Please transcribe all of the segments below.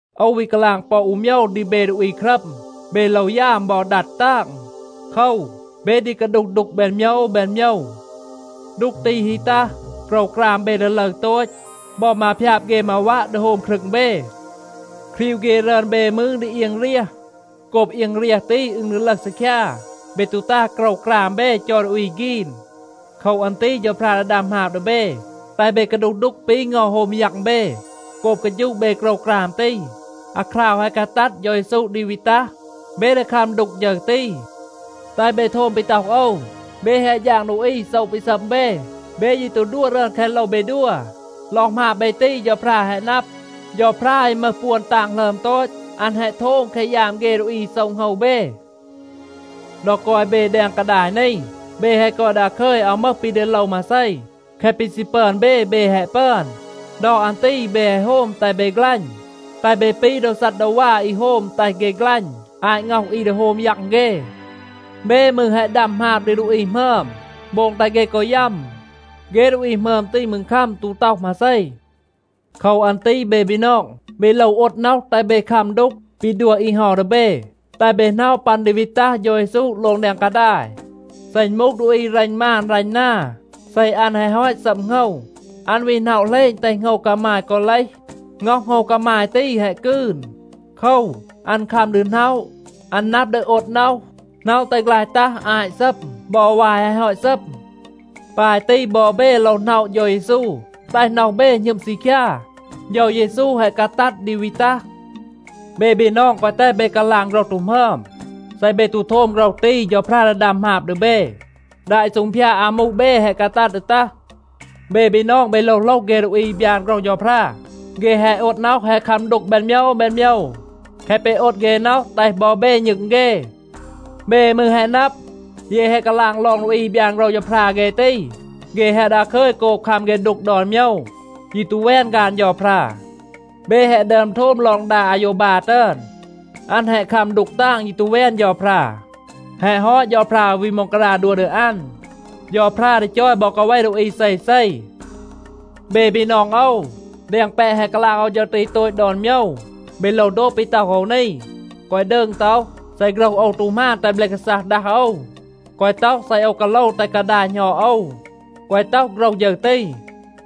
โอว วี กาลาง ปอ อู โมยว ดี เบ ดูอี ครัม. เบ โลว ยาม บอ ดัด ตาง. โคว, เบ ดี กาดูห ดูก แบน โมยว แบน โมยว. ดูก ตี ฮี ตัห, โกรวกราม เบ ดี ลึร โตต. บอ มาพยาบ เฆ มาวัะ ดี โฮม ครึง เบ. ครีว เฆ รึอน เบ มืร ดี เอียง เรียห. โกบ เอียง เรียห ตี อึณ ดี ลึห ซีคยา, เบ ตู ตา โกรวกราม เบ, จอย ดูอี ฆีน. โคว อัน ตี เฌาพรา ดี ดัม หมาบ ดี เบ, แตห เบ กาดูห ดูก ปี เงา โฮม ยัง เบ. โกบ กาฌูะ เบ โกรวกราม ตี, อาคราว แฮะ กาตัด เฌา เยซู ดี วี ตัห, เบ ดี คัม ดูก ฌึร ตี. แตห เบ โทม ปี ต็อห โอว. เบ แฮะ ฌาง ดูอี โซะ ปี ซัม เบ. เบ ยี ตู ดัว รึอน แคะ โลว เบ ดัว. ลอง หมาบ เบ ตี เฌาพรา แฮะ นับ. เฌาพรา อี มึห ปวน ตาง หลึอม โตต, อัน แฮะ โทม แคะ ยาม เฆ ดูอี อี โซะ โหงว เบ. ดอ กอย เบ แดง กาดาย นี, เบ แฮะ กอย ดาคึย, อาว มึห ปี ดี โลว มาเซ. แคะ ปี ซี ปึอน เบ, เบ แฮะ ปึอน. ดอ อัน ตี เบ แฮะ โฮม แตห เบ ฆลัณ แตห เบ ปี โดว ซัดดาวา อี โฮม แตห เฆ ฆลัณ อาต ง็อห อี ดี โฮม ยัง เฆ. เบ มืร แฮะ ดัม หมาบ ดี ดูอี หมึอม, โบง แตห เฆ กอ ยัม. เฆ ดูอี หมึอม ตี มืร คัม, ตู ต็อห มาเซ. โคว อัน ตี เบ บีนอง, เบ โลว โอด น็อห, แตห เบ คัม ดูก ปี ดัว อี เฮา ดี เบ, แตห เบ หน็อะ ปัน ดี วี ตัห เฌา เยซู โลง แดง กาดาย. เซ อึณ มูห ดูอี รัณ มาน รัณ นา, เซ อัน แฮะ ฮอต ซัม โหงว, อัน วี หน็อะ เหลณ, แตห โหงว กามาย กอ เลห. ง็อห โหงว กามาย ตี แฮะ กืน. โคว, อัน คัม ดี หน็อะ. อัน นับ ดี โอด น็อห, หน็อะ แตห ฆลาย ตัห อาต ซัม บอ วาย แฮะ ฮอต ซัม. ปาย ตี บอ เบ โลว หน็อะ เฌา เยซู, แตห น็อห เบ หณึม ซีคยา. เฌา เยซู แฮะ กาตัด ดี วี ตัห. เบ บีนอง, แกวะ แตห เบ กาลาง โฆรห ตู หมึอม. เซ เบ ตู โทม โฆรห ตี, เฌาพรา ดี ดัม หมาบ ดี เบ. ดา อี ซูงพยาด อามู เบ แฮะ กาตัด ดี ตัห. เบ บีนอง, เบ โลว โหลห เฆ ดูอี อี บยาน โฆรห เฌาพรา. เฆ แฮะ โอด น็อห, แฮะ คัม ดูก แบน โมยว แบน โมยว. แคะ ปี โอด เฆ น็อห, แตห บอ เบ ณึง เฆ. เบ มืร แฮะ นับ, เย แฮะ กาลาง ลอง ดูอี อี บยาน โฆรห เฌาพรา เฆ ตี, เฆ แฮะ ดาคึย โกบ คัม เฆ ดูก ดอน โมยว, ยี ตู แวน ฆาน เฌาพรา. เบ แฮะ ดึอม โทม ลอง ดา อาโยวบา ตึอน. อัน แฮะ คัม ดูก ตาง, ยี ตู แวน เฌาพรา. แฮะ ฮอต, เฌาพรา วี ม็องการา ดัว ดี อัน. เฌาพรา ดี จอย บอ กาเว ดูอี เซเซ. เบ บีนอง โอว, แดง แปะ แฮะ กาลาง โอว ฌึร ตี โตต ดอน โมยว, เบ โลว โดบ ปี ต็อห โอว นี. แกวะ ดืง ต็อห, “เซ โฆรห โอว ตู หมาน, แตห เบล กาซัห ดัห โอว.” แกวะ ต็อห, “เซ โอว กาโลว, แตห กาดาย หณอด โอว.” แกวะ ต็อห โฆรห ฌึร ตี.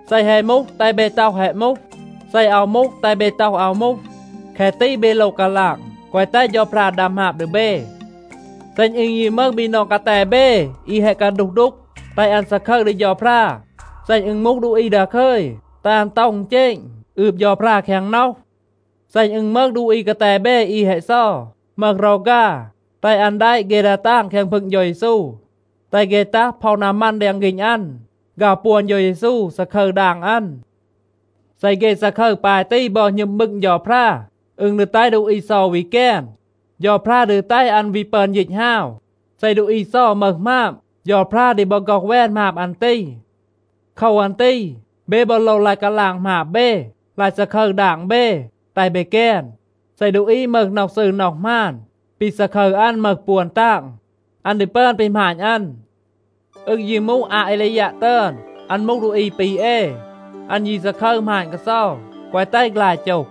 เซ แฮะ มูห, แตห เบ ต็อห “แฮะ มูห.” เซ อาว มูห, แตห เบ ต็อห, “อาว มูห.” แคะ ตี เบ โลว กาลาง, แกวะ แตห เฌาพรา ดัม หมาบ ดี เบ. เซ อึณ ยี มึห บีนอง กาแต เบ, อี แฮะ กาดูห ดูก, แตห อัน ซาคึร ดี เฌาพรา. เซ อึณ มูห ดูอี ดาคึย, แตห อัน ต็อห อึณเจณ, อืบ เฌาพรา แคง น็อห. เซ อึณ มึห ดูอี กาแต เบ อี แฮะ เซา, มึห รอฆา, แตห อัน แดะ เฆ ดา ตาง แคง พึง เฌา เยซู. แตห เฆ ตัห, พ็อห นามัน แดง ฆีณ อัน, ฆาว ปวน เฌา เยซู, ซาคึร ดาง อัน. เซ เฆ ซาคึร ปาย ตี บอ หณึม บึง เฌาพรา, อึณ ดี แตห ดูอี เซา วี แกน. เฌาพรา ดี แตห อัน วี ปึอน ยีต ฮาว. เซ ดูอี เซา มึห หมาบ, เฌาพรา ดี บอ ฆ็อห แวน หมาบ อัน ตี. โคว อัน ตี เบ บอ โลว ลาย กาลาง หมาบ เบ, ลาย ซาคึร ดาง เบ, แตห เบ แกน. เซ ดูอี มึห น็อห ซืร น็อห หมาน, ปี ซาคึร อัน มึห ปวน ตาง. อัน ดี ปึอน ปี หมาณ อัน. อึณ ยี มูห อาเอลียัะ ตึอน, อัน มูห ดูอี ปี เอ. อัน ยี ซาคึร หมาณ กาเซา, แกวะ แตห ฆลาย โจห.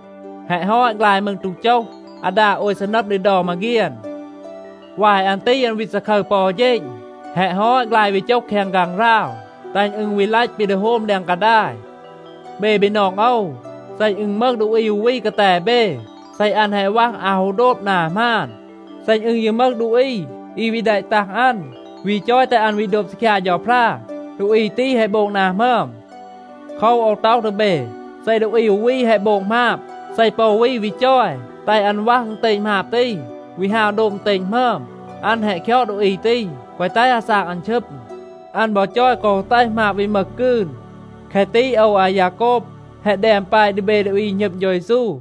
แฮะ ฮอต ฆลาย มืร ตู โจห อาดา โอย ซีนัม ดี เดา มาเฆียน. วาย อัน ตี อัน วี ซาคึร ปอ อู เฌณ. แฮะ ฮอต, ฆลาย วี โจห แคง ฆางหราว, แตห อึณ วี ลัต ปี ดี โฮม แดง กาดาย. เบ บีนอง โอว, เซ อึณ มึห ดูอี อู วี กาแต เบ, เซ อัน แฮะ วัห อาว ฮู โดบ นา หมาน. เซ อึณ ยี มึห ดูอี อี วี แดะ ตัห อัน, วี จอย แตห อัน วี โดบ ซีคยา เฌาพรา, ดูอี ตี แฮะ โบง นา หมึอม. โคว, โอว ต็อห ดี เบ, เซ ดูอี อู วี แฮะ โบง หมาบ, เซ ปอ อู วี วี จอย แตห อัน วัห อึณเตณ หมาบ ตี, วี ฮาว โดบ อึณเตณ หมึอม, อัน แฮะ คยอด ดูอี ตี, แกวะ แตห อาซาก อัน ชึม. อัน บอ จอย แกวะ ฮู แตห หมาบ วี มึห กืน. แคะ ตี โอว อายาโกบ แฮะ แดม แปะ ดี เบ ดูอี อี หณึม เฌา เยซู.